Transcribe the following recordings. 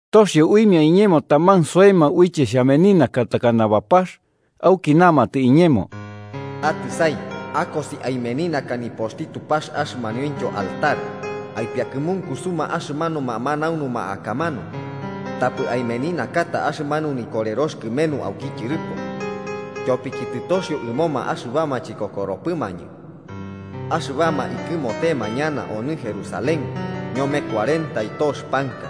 Toxio uimia iñemo taman soema uiche xhameninaka takana bapax, auki namatɨ iñemo: “Atɨsai akosi aimeninaka nipoxti Tupax axɨmanuintyo altar, aipiakɨmunkusuma axɨmanuma manaunuma akamanu. Tapɨ aimeninakata axɨmanu nikorerox kɨmenu auki tyɨrɨpo, tyopiki tɨtoxio ɨmoma axɨbama chikokoropɨmañɨ, axɨbama ikɨmotema ñana onɨ Jerusalén ñome cuarenta y tox panka.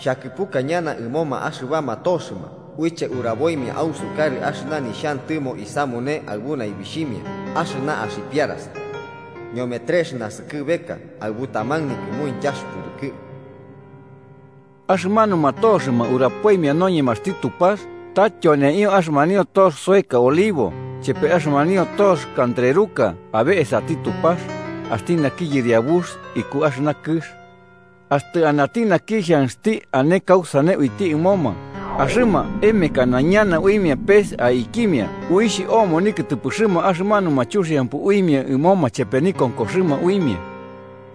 Xhakɨpuka ñana ɨmoma axɨbama toxɨma uiche uraboimia ausukarɨ axɨna nixhantɨmo isamune aɨbu naibixhimia axɨna axipiarasa, ñome trex naskɨbeka aɨbu taman nikɨmuintyax pɨrɨkɨ.” Axɨmanuma toxɨma urapoimia noñemaxti Tupax ta tyoneio axɨmanio tox soeka olivo chepe axɨmanio tox kantreruka abe esati Tupax, axti naki yɨriabux iku axɨna kɨx. Axtɨ anati naki xhanxti ane kausane uiti ɨmoma, axɨma emekana ñana uimia pes aikimia uixh omo nikɨtɨpɨxɨma axɨmanuma chuxiampɨ uimia ɨmoma chepe nikonkoxɨma uimia.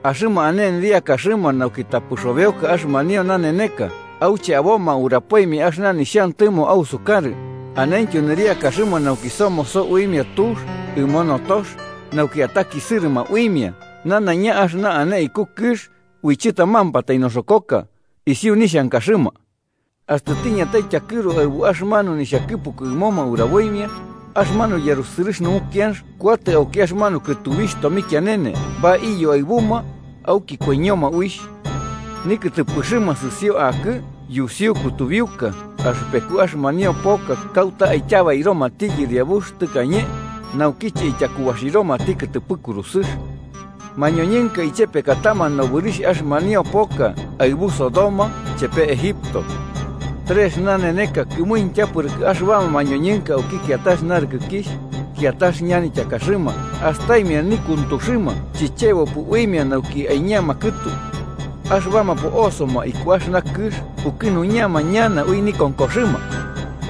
Axɨma ane nɨriakaxɨma nauki tapɨ xobeoka axɨmanio naneneka auche aboma urapoimia axɨna nixhantɨmo ausukarɨ, anentyo nɨriakaxɨma nauki somoso uimia tux ɨmo notox nauki atakisɨrɨma uimia nanaiña axɨna ane iku kɨx ui chɨtamampatai noxokoka, isiu nixhankaxɨma. Axtɨ tiñatai tyakɨru aɨbu axɨmanu nixhakɨpuku ɨmoma uraboimia, axɨmanu yarusɨrɨx numukianx kuatɨ auki axɨmanu kɨtubixh tomikianene baiyo aɨbuma, auki koiñoma uixh. Nikɨtɨpɨxɨma sɨsio akɨ yusiu kutubiuka axɨpeku axɨmanio poka kauta aityabairomati Yɨriabux tɨkañe naukiche ityakubaxiromati kɨtɨpɨ kurusɨx. Mañoñɨnka ichepekatama nobɨrixh axɨmanio poka aɨbu Sodoma chepe Egipto. Trex naneneka kɨmuintya pɨrɨkɨ, axɨbama mañoñɨnka auki kiatax narɨkɨkixh, kiatax ñanityakaxɨma astaimia nikuntuxɨma chichebopɨ uimia nauki aiñama kɨtu. Axɨbama po'osoma iku axɨna kɨx pukɨnuñama ñana ui nikonkoxɨma.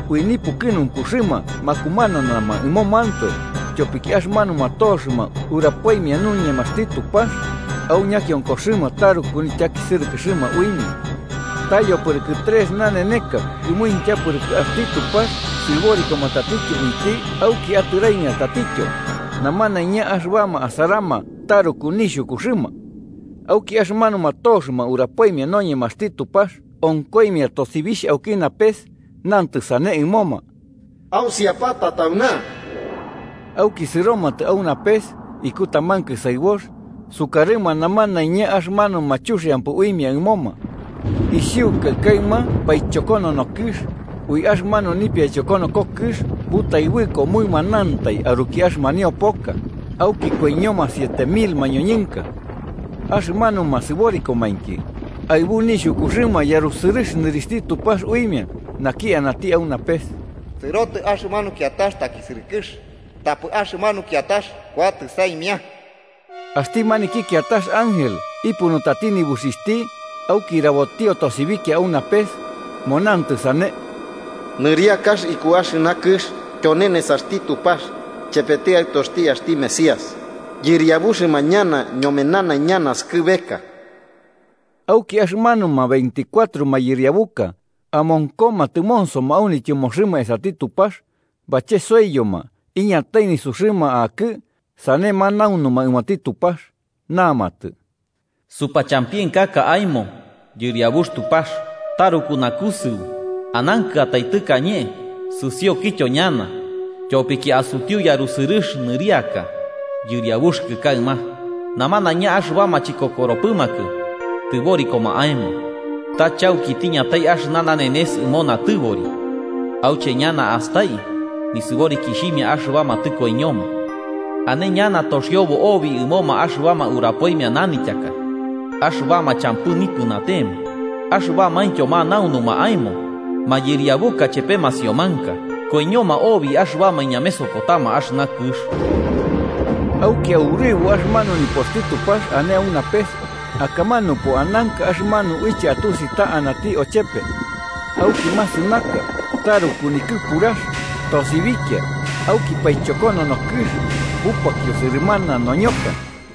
Ui nipukɨnunkuxɨma makumananama ɨmomantoe, tyopiki axɨmanuma toxɨma urapoimia noñemaxti Tupax, au ñakionkoxɨma taruku nityakisɨrɨkɨxɨma uimia. Ta yopɨrɨkɨ trex naneneka kɨmuintya pɨrɨkɨ, axti Tupax sɨborikoma tatityo uiti auki atɨraimia tatityo, namanaiña axɨbama asarama taruku nixhukuxɨma. Auki axɨmanuma toxɨma urapoimia noñemaxti Tupax onkoimia tosibixh auki napes, nantɨ sane ɨmoma: “¡Ausiapata tauna!” Auki sɨromatɨ au napes iku taman kɨsaɨbox, sukarɨma namanaiña axɨmanuma chuxiampɨ uimia ɨmoma. Isiukai kaɨma paichokonono kɨx, ui axɨmanu nipiaichokonoko kɨx butaɨbɨko mɨmanantai aruki axɨmanio poka, auki koiñoma siete mil mañoñɨnka. Axɨmanuma sɨborikomainki, aɨbu nixhukuxɨma yarusɨrɨx nɨrixhti Tupax uimia, naki anati au napes. Sɨrotɨ axɨmanu kiatax takisɨrɨkɨx, tapɨ axɨmanu kiatax kuatɨ saimia. Axti maniki kiatax ángel ipunutati nibuxixhti, auki rabotio tosibikia au napes, monantɨ sane: “Nɨriakax ikuki axɨna kɨx tyone nesaxti Tupax chepeti Aɨtoxti axti Mesías, yɨriabuxɨma ñana ñome nanaiña naskɨbeka.” Auki axɨmanuma veinticuatro mayɨriabuka amonkoma tɨmonsoma au nityɨmoxɨma esati Tupax, bachesoiyoma iñatai nisuxɨma akɨ sane manaunuma ɨmoti Tupax, namatɨ: “Supachampienkaka aemo, Yɨriabux, Tupax, taruku nakusɨu, anankɨatai tɨkañe sɨsiokɨtyo ñana, tyopiki asutiu yarusɨrɨx nɨriaka yɨriabuxɨkɨ kaɨma. Namanaiña axɨbama chikokoropɨmakɨ tɨborikoma aemo. Ta chauki tiñatai axɨna nanenes ɨmo natɨbori. auche ñana astai nisɨborikixhimia axɨbama tɨkoiñoma. ane ñana toxiobo obi ɨmoma axɨbama urapoimia nanityaka axɨbama champɨ nipɨnatema axɨbamaintyo manaunuma aemo, mayɨriabuka chepe masiomanka. Koiñoma obi axɨbama iñamesokotama axɨna kɨx.” Auki aurɨbo axɨmanu nipoxti Tupax ane au napes, akamanupo ananka axɨmanu uiche atusi ta anati ochepe. Auki masɨnaka, taruku nikɨpurax, tosibikia auki paichokonono kɨx bupakio sɨrɨmana noñoka.